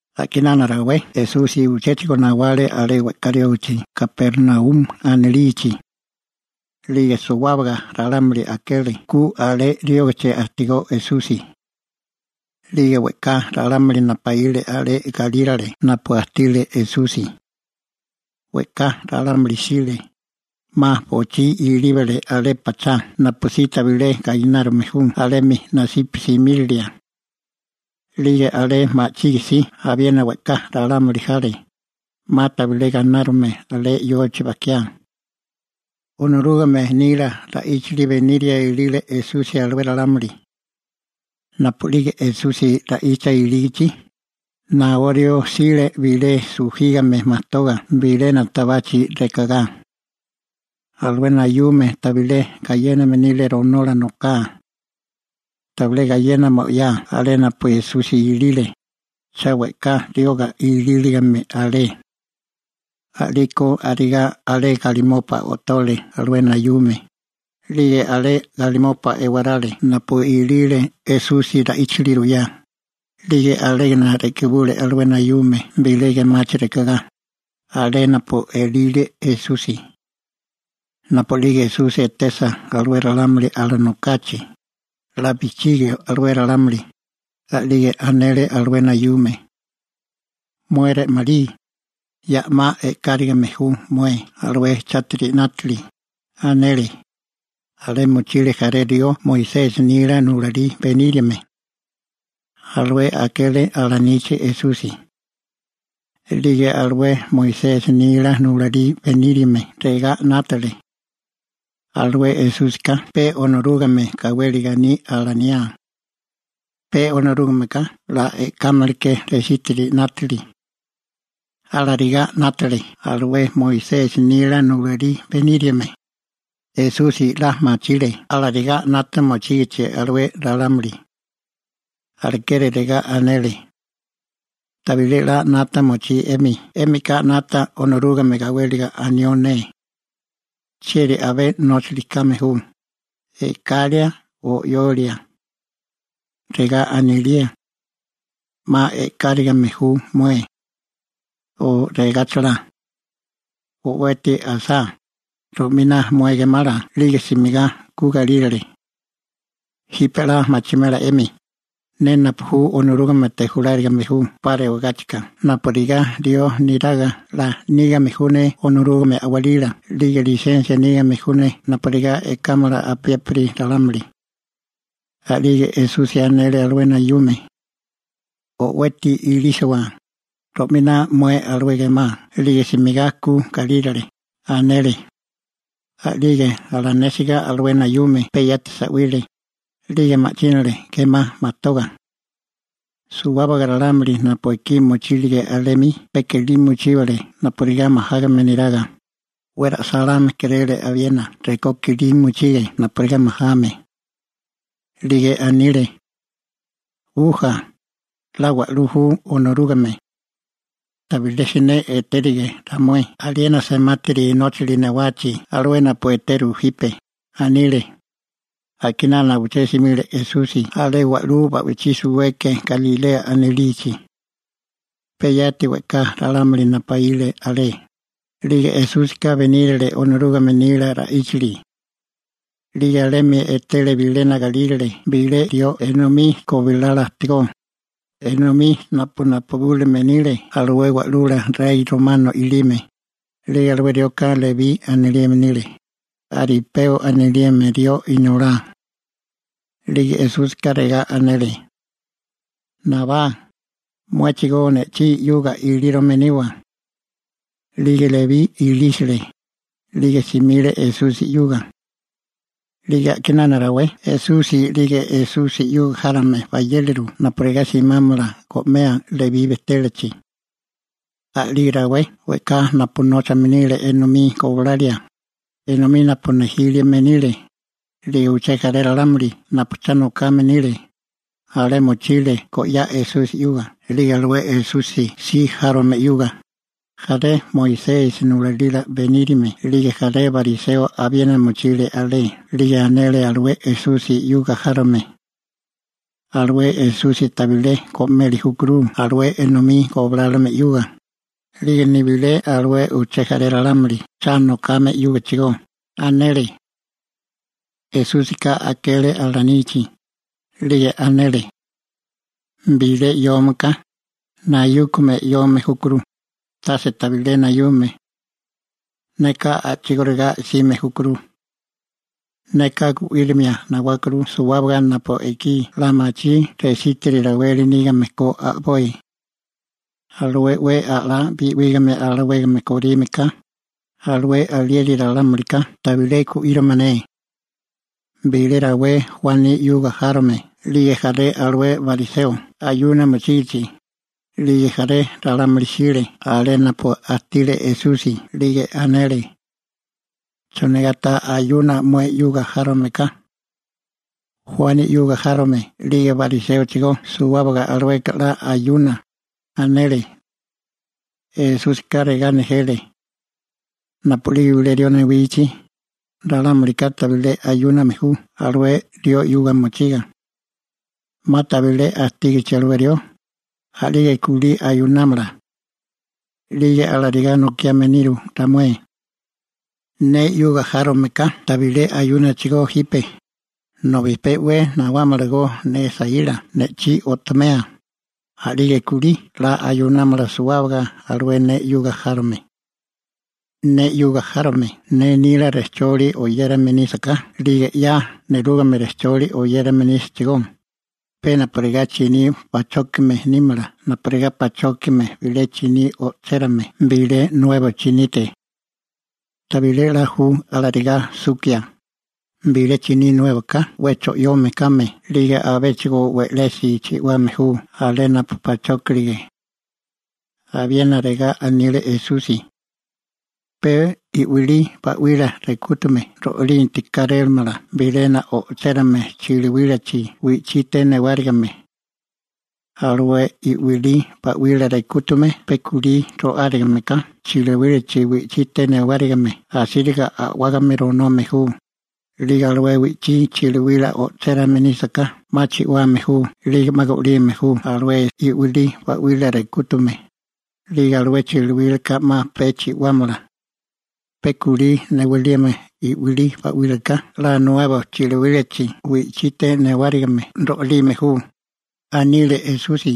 A'kinana rawé Esusi uchéchigo nawale alé we'ká riógichi Kapernaumi anilichi, 'lige suwábaga ralámuli akele ku alé riógichi ajtigó Esusi. 'Lige we'ká ralámuli napaíle alé galírale napu ajtile Esusi. We'ká ralámuli jsile, 'ma bochí ilíbale alé pachá napusí tabilé gainárume ju alemi nasípami simírilia. 'Lige alé ma'chige si abiena we'ká ralámuli jale, 'ma tabilé ganárume alé yochi bajkiá. Onorúgame nila ra'íchili beniria ilile Esusi alué ralámuli. Napu'lige Esusi ra'icha ilígichi, naó rió jsile bilé sujígame majtoga bilena tabachi rekagá. Alué nayúmeka tabilé gayéname nile ronola noká. Tabilé gayénale mo'yá alé napu Esusi ilile, cha we'ká rioga ilíligame alé. A'liko arigá alé galimopa o'tole alué nayume, 'lige alé galimopa ewarale napu ilile Esusi ra'íchili ruyá, 'lige alégana re'kibule alué nayume bilé gemachi rekagá, alé napu ilile Esusi. Napu'lige Esusi etesa alué ralámuli alanokachi, 'la bijchigio alué ralámuli, a'lige anele alué nayume: ―Mué re'malí, ya 'ma e'kárigime ju mué alué chátiri 'nátili ―anele. Alé mochile jaré rió Moisesi nila nulalí beníriame. Alué akele alanichi Esusi. A'lige alué Moisesi nila nulalí beníriame regá 'nátale: «Alué Esúsika pe Onorúgame gawéliga aní alaniá. Pe Onorúgameka 'la e'kámaleké resítiri 'nátili.» Alarigá 'nátale alué Moisesi nila nulalí beníriame. Esusi 'la machile alarigá 'nata mochígichi alué ralámuli. Alekeri regá anele: ―Tabilé 'la 'nata mochí 'emi, 'émika 'nata Onorúgame gawéliga anió ne. ¿Chieri abé nóchali kame ju, e'kalia o 'yolia? ¿Regá anilía: «'Ma e'káragime ju mué», o regáchala: «O'weti asá, ro'miná mué gemala 'lige simigá ku galírale»? Jipe 'la machimela 'emi, ne napu ju Onorúgamete julárigame 'pa rewagáchika napurigá rió neraga 'la nígame ju ne Onorúgame a'walila 'lige lisensia nígame ju ne napurigá e'kámala apiépiri ralámuli. A'lige Esusi anele alué nayume: ―O'weti ilísiwa, ro'miná mué alué gemá 'lige simigá ku galírale ―anele. A'lige alanésiga alué nayume, pe yati sa'wile, 'lige ma'chínale gemá majtoga. Suwábaga ralámuli napu ekí mochílige alemi, pe kilí mochíbale napurigá majágame neraga, 'we ra'sáláme kéréle abiena rekó kilí mochige napurigá majame. 'Lige anile: ―¡Uja, 'la wa'lú ju Onorúgame! ¡Tabilé siné etérige ramué aliena semátiri nóchali newachi alué napu eteru jipe! ―anile. A'kinana uché simile Esusi alé wa'lú ba'wichí suweke Galilea anilichi. Pe yati we'ká ralámuli napaíle alé, 'lige Esúsika benírale Onorúgame nila ra'íchili. 'Lige alemi etele bilena galírale bilé rió enomí gobilala ajtigó, enomí napu napubúlime nile alué wa'lula rey romano i'lime, 'lige alué rioka Lebí anilime nile, Alipeo anilime rió inolá. 'Lige Esúsika regá anele: ―Nabá, muéchigó ne'chí 'yuga ilírome niwa. 'Lige Lebí ilísale, 'lige simile Esusi 'yuga. 'Lige a'kinana rawé Esusi 'lige Esusi 'yuga járome bayéleru napurigá simámala go'mea Lebí bejtélachi. A'lige rawé we'ká napu nóchame nile enomí gobilalia, enomí napu nejílime nile, 'lige uché jaré ralámuli napu cha nokame nile, alé mochile go'yá Esusi 'yuga 'lige alué Esusi si járome 'yuga. Jaré Moisesi nulalila beníriame 'lige jaré bariseo abiena mochile alé, 'lige anele alué Esusi 'yuga járome: ―Alué Esusi tabilé go'meli júkuru alué enomí goblálome 'yuga, 'lige nibilé alué uché jaré ralámuli cha nokame 'yúgachigó ―anele. Esúsika akele alanichi, 'lige anele: ―Bilé 'yome ka, nayúkame 'yome júkuru, tase tabilé nayume. Neka a'chigóriga 'sime júkuru. Neka gu'írimia nawákuru suwábaga napu ekí 'la machí resítiri raweli nígame ko a'boi. Alué 'we a'lá bi'ígame alawégame korime ka, alué alieri ralámulika tabilé gu'írimala ne. Bilé rawé Juani 'yuga járome 'lige jaré alué bariseo ayuna mochígichi, 'lige jaré ralámuli jsile alé napu ajtile Esusi, 'lige anele: ―¿Chonigá ta ayuna mué 'yuga járome ka? Juani 'yuga járome 'lige bariséochigó suwábaga alueka 'la ayuna ―anele. Esúsika regá nejele: ―Napu'lige bilé rió newichi, ralámulika tabilé ayúname ju alué rió 'yuga mochiga. 'Ma tabilé ajtígachi alué rió, a'lige kulí ayunámala. 'Lige alarigá nokiame niru ramué. Ne 'yuga járome ka tabilé ayúnachigó jipe, nobi pe 'we nawámalagó ne saíla ne'chí o'tomea, a'lige kulí 'la ayunámala suwábaga alué ne 'yuga járome. › Ne 'yuga járome ne nila rejcholi oyérame nísaká, 'lige 'ya nerúgame rejcholi oyérame nísachigó, pe napurigá chiní pachókime nímala napurigá pachokia bilé chiní o'chérame bilé nuebo chinite. Tabilé 'la ju alarigá sukia, bilé chiní nuéboká 'we cho'yome kame 'lige abéchigo we'lesi chi'wame ju alé napu pachókirige. Abiena regá anile Esusi: ―Pe i'wilí ('uba) ba'wila rekútume ro'linti kárélamala bilena o'chérame chiliwílachi wi'chite newárigime. Alué i'wilí ba'wila rekútume pe kulí ro'árigame ka chiliwílachi wi'chite newárigime asíriga a'wágame ronome ju, 'lige alué wi'chí chiliwila o'chérame nísaká 'ma chi'wame ju 'lige 'ma go'lime ju alué i'wilí ba'wila rekútume, 'lige alué chiliwílaka 'ma pe chi'wámala. Pe kulí newalime i'wilí ba'wílaka 'la nuebo chiliwílachi wi'chite newárigime ro'lime ju ―anile Esusi.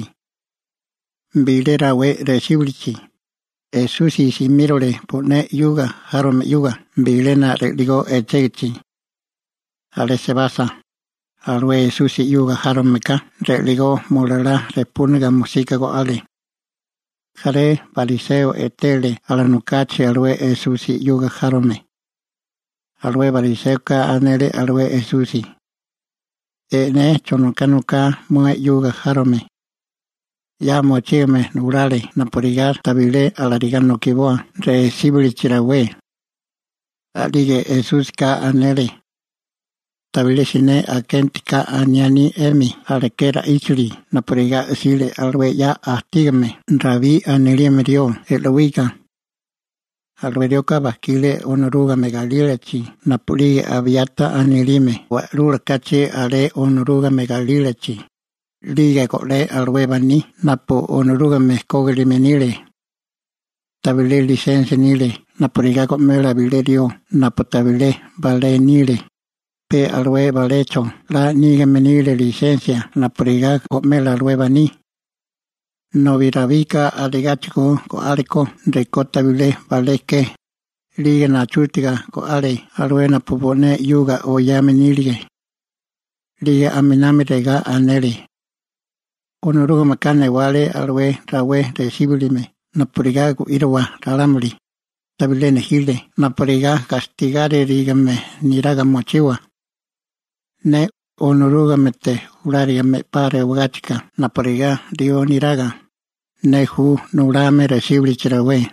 Bilé rawé resíbilichi, Esusi simírole bo'né 'yuga járome 'yuga bilena ri'ligó echégichi. Alé sebasa, alué Esusi 'yuga járome ka ri'ligó mulalá rejpúniga mosika go'ale. Jaré bariseo etele alanokachi alué Esusi 'yuga járome. Alué bariséoka anele alué Esusi: ―E'né chonoká noká mué 'yuga járome. 'Ya mochígame nulale napurigá tabilé alarigá nokiboa resíbilichi rawé. A'lige Esúsika anele: ―Tabilé siné akenti ka aniání 'emi aleké ra'íchili napurigá 'sile alué 'ya ajtígame Rabí anilime rió e'lowika. Alué rioka bajkile Onorúgame galílachi napu'lige Abiata anilime wa'lula kachi alé Onorúgame galílachi, 'lige go'lé alué baní napu Onorúgame kógilime nile. Tabilé lisensia nile napurigá go'mela bilé rió napu tabilé balé nile, pe alué balecho 'la nígame nile lisensia napurigá go'mela alué baní. Nobi Rabika arigáchigo go'ale ko rekó tabilé balé ke, 'lige nachútaga go'ale alué napu bo'né 'yuga oyame nílige. 'Lige aminami regá anele: ―Onorúgameka newale alué rawé resíbilime napurigá gu'írowa ralámuli, tabilé nejile napurigá gastigáririgame neraga mochiwa. Ne, Onorúgamete julárigame 'pa rewagáchika napurigá rió neraga, ne ju nulame resíbilichi rawé.